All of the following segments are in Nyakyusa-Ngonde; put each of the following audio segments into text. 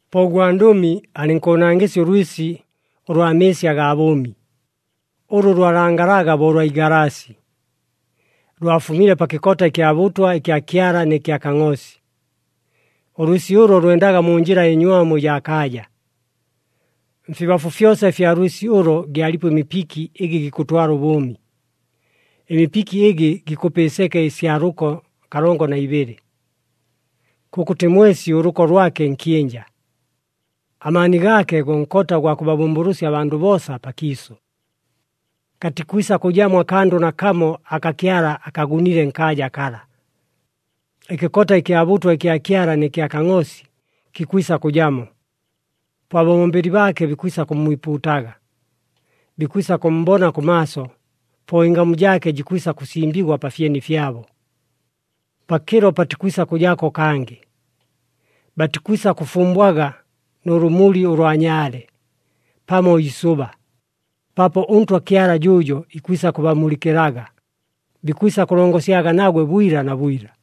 Po ʉgwandʉmi alɨnkʉʉnangɨsya ʉlwɨsi ʉlwa mɨɨsi agaa bʉʉmi, ʉlʉ lwalangalaga bo ʉlwa igalaasi. Lwafumile pa kɨkota ɨkya bʉtwa ɨkya Kyala nɨ kya Kangʼoosi. Ʉlwɨsi ʉlo lwendaga mu njɨla ɨnywamu ɨjaa kaaja. Mfibafu fyosa ɨfya lwɨsi ʉlo gyalipo ɨmipiki ɨgɨ gikʉtwala ʉbʉʉmi. Ɨmipiki ɨgɨ gikʉpa ɨseke ɨsya lʉko kalongo na ibɨlɨ. Kʉkʉtɨ mwesi ʉlʉko lwake nkyɨnja. Amaani gaake go nkota ʉgwa kʉbabʉmbʉlʉsya abandʉ boosa pakiisʉ. Katikwisa kʉjamo akandʉ nakamo aka Kyala akagunile nkaaja kala. Ɨkɨkota ɨkya bʉtwa ɨkya Kyala nɨ kya Kangʼoosi kikwisa kʉjamo. Po ababombeli baake bikwisa kʉmmwipuutaga. Bikwisa kʉmmbona kʉmaaso, po ɨngamu jaake jikwisa kʉsimbigwa pa fyeni fyabo. Pakɨlo patikwisa kʉjako kangɨ. Batikwisa kʉfumbwaga nʉ lʉmuli ʉlwa nyaale pamo iisʉba, paapo ʉNtwa Kyala jʉʉjo ikwisa kʉbamulɨkɨlaga, bikwisa kʉlongosyaga nagwe bwila na bwila.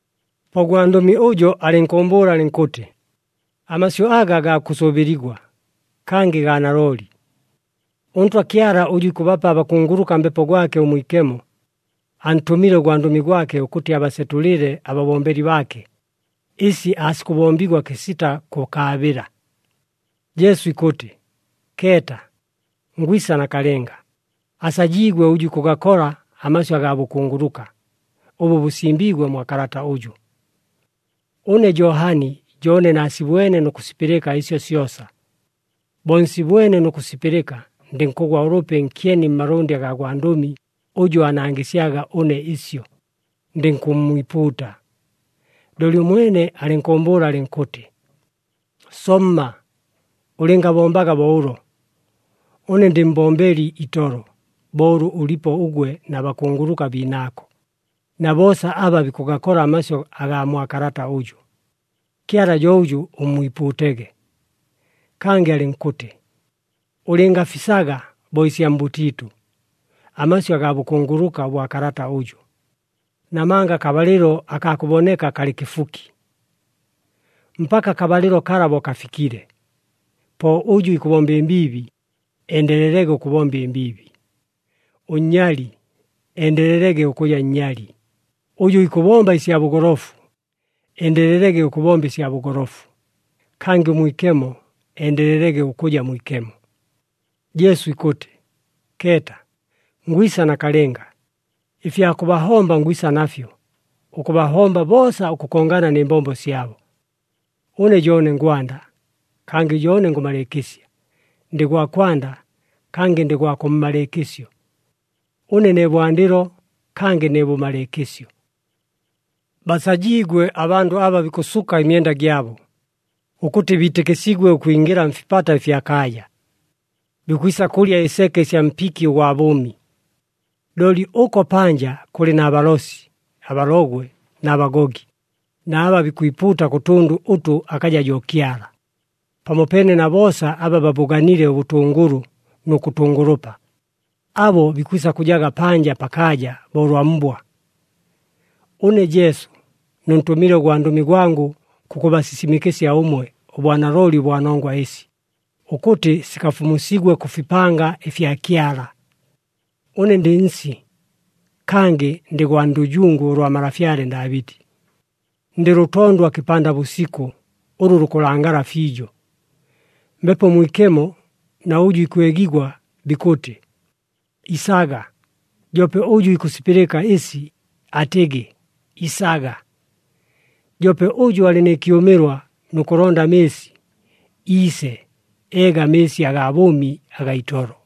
Po ʉgwandʉmi ʉjo alɨnkʉʉmbʉʉla alɨnkʉtɨ, “Amasyʉ aga gaa kʉsʉʉbɨligwa, kangɨ gaa nalooli. ɄNtwa Kyala ʉjʉ ikʉbapa abakunguluka Mbepo gwake ʉMwikemo, antʉmile ʉgwandʉmi gwake, ʉkʉtɨ abasetʉlɨle ababombeli baake, ɨsi aasikʉbombigwa kɨsita kʉkaabɨla.” Jesu ikʉtɨ, “Keeta! Ngwisa nakalɨnga. Asajiigwe ʉjʉ ikʉgakola amasyʉ agaa bʉkunguluka, ʉbʉ bʉsimbiigwe mwa kalata ʉjʉ.” Ʉne Johani jo ʉne naasibwene nʉ kʉsipɨlɨka ɨsyo syosa. Bo nsibwene nʉ kʉsipɨlɨka, ndɨnkʉgwa ʉlʉpi nkyeni mmalʉndɨ agaa gwandʉmi ʉjʉ aanangɨsyaga ʉne ɨsyo, ndɨnkʉmmwipuuta. Looli ʉmwene alɨnkʉʉmbʉʉla alɨnkʉtɨ, “Somma! Ʉlɨngabombaga bo ʉlo! Ʉne ndɨ mbombeli itolo, bo ʉlʉ ʉlipo ʉgwe na bakunguluka biinaako, na boosa aba bikʉgakola amasyʉ agaa mwa kalata ʉjʉ. Kyala jo ʉjʉ ʉmmwipuutege!” Kangɨ alɨnkʉtɨ, “Ʉlɨngafisaga bo ɨsya mbʉtiitʉ, amasyʉ agaa bʉkunguluka ʉbwa kalata ʉjʉ, namanga akabalɨlo akaa kʉboneka kalɨ kɨfuki. Mpaka akabalɨlo kala bo kafikile, po ʉjʉ ikʉbomba ɨmbiibi endelelege ʉkʉbomba ɨmbiibi, ʉnnyali endelelege ʉkʉja nnyali, ʉjʉ ikʉbomba ɨsya bʉgolofu endelelege ʉkʉbomba ɨsya bʉgolofu, kangɨ ʉmwikemo endelelege ʉkʉja mwikemo.” Jesu ikʉtɨ, “Keeta! Ngwisa nakalɨnga. Ɨfya kʉbahomba ngwisa nafyo, ʉkʉbahomba boosa ʉkʉkongana nɨ mbombo syabo. Ʉne jo ʉne ngwanda, kangɨ jo ʉne ngʉmalɨɨkɨsya. Ndɨ gwa kwanda, kangɨ ndɨ gwa kʉmmalɨɨkɨsyo. Ʉne ne bwandɨlo, kangɨ ne bʉmalɨɨkɨsyo.” Basajiigwe abandʉ aba bikʉsuka ɨmyenda gyabo, ʉkʉtɨ biitɨkɨsigwe ʉkwingɨla mfipata ɨfya kaaja. Bikwisa kʉlya ɨseke ɨsya mpiki ʉgwa bʉʉmi. Looli ʉko panja kʉlɨ na balosi, abalogwe na bagogi, na aba bikwipuuta kʉ tʉndʉ ʉtʉ akaja jo Kyala, pamopeene na boosa aba babʉganile ʉbʉtʉngʉlʉ nʉ kʉtʉngʉlʉpa. Abo bikwisa kʉjaga panja pakaaja bo ʉlwa mbwa. “Ʉne Jesu, nʉntʉmile ʉgwandʉmi gwangʉ kʉkʉbasisimɨkɨsya ʉmwe ʉbwanalooli ʉbwa nongwa ɨsi, ʉkʉtɨ sikafumusigwe kʉ fipanga ɨfya Kyala. Ʉne ndɨ nsi, kangɨ ndɨ gwa ndʉjungu ʉlwa malafyale Ndaabɨti, ndɨ lʉtondwa kɨpanda bʉsikʉ ʉlʉ lukʉlangala fiijo.” Mbepo Mwikemo na ʉjʉ ikwegigwa bikʉtɨ, “Isaga!” Joope ʉjʉ ikʉsipɨlɨka ɨsi atɨgɨ, “Isaga!” Joope ʉjʉ alɨ nɨ kyʉmɨlwa nʉ kʉlonda amɨɨsi, iise eege amɨɨsi agaa bʉʉmi agaa itolo.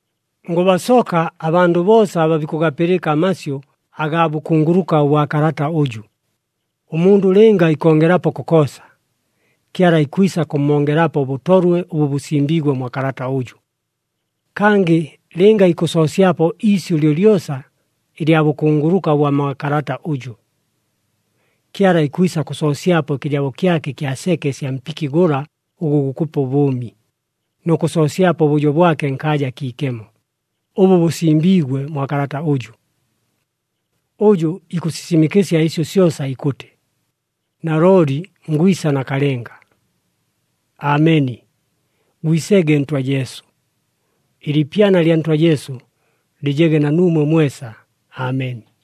Ngʉbasoka abandʉ boosa aba bikʉgapɨlɨka amasyʉ agaa bʉkunguluka ʉbwa kalata ʉjʉ. Ʉmundʉ lɨnga ikongelapo kokoosa, Kyala ikwisa kʉmmongelapo ʉbʉtolwe ʉbʉ bʉsimbiigwe mwa kalata ʉjʉ. Kangɨ lɨnga ikʉsoosyapo iisyʉ lyolyosa ɨlya bʉkunguluka ʉbwa mwa kalata ʉjʉ, Kyala ikwisa kʉsoosyapo ɨkɨjabo kyake ɨkya seke ɨsya mpiki gʉla ʉgʉ gukʉpa ʉbʉʉmi, nʉ kʉsoosyapo ʉbʉjo bwake nkaaja akiikemo, ʉbʉ bʉsimbiigwe mwa kalata ʉjʉ. Ʉjʉ ikʉsisimɨkɨsya ɨsyo syosa ikʉtɨ, “Nalooli ngwisa nakalɨnga.” Ameni. Gwisege Ntwa Jesu! Ɨliipyana lya Ntwa Jesu lɨjege na nuumwe mwesa. Ameni.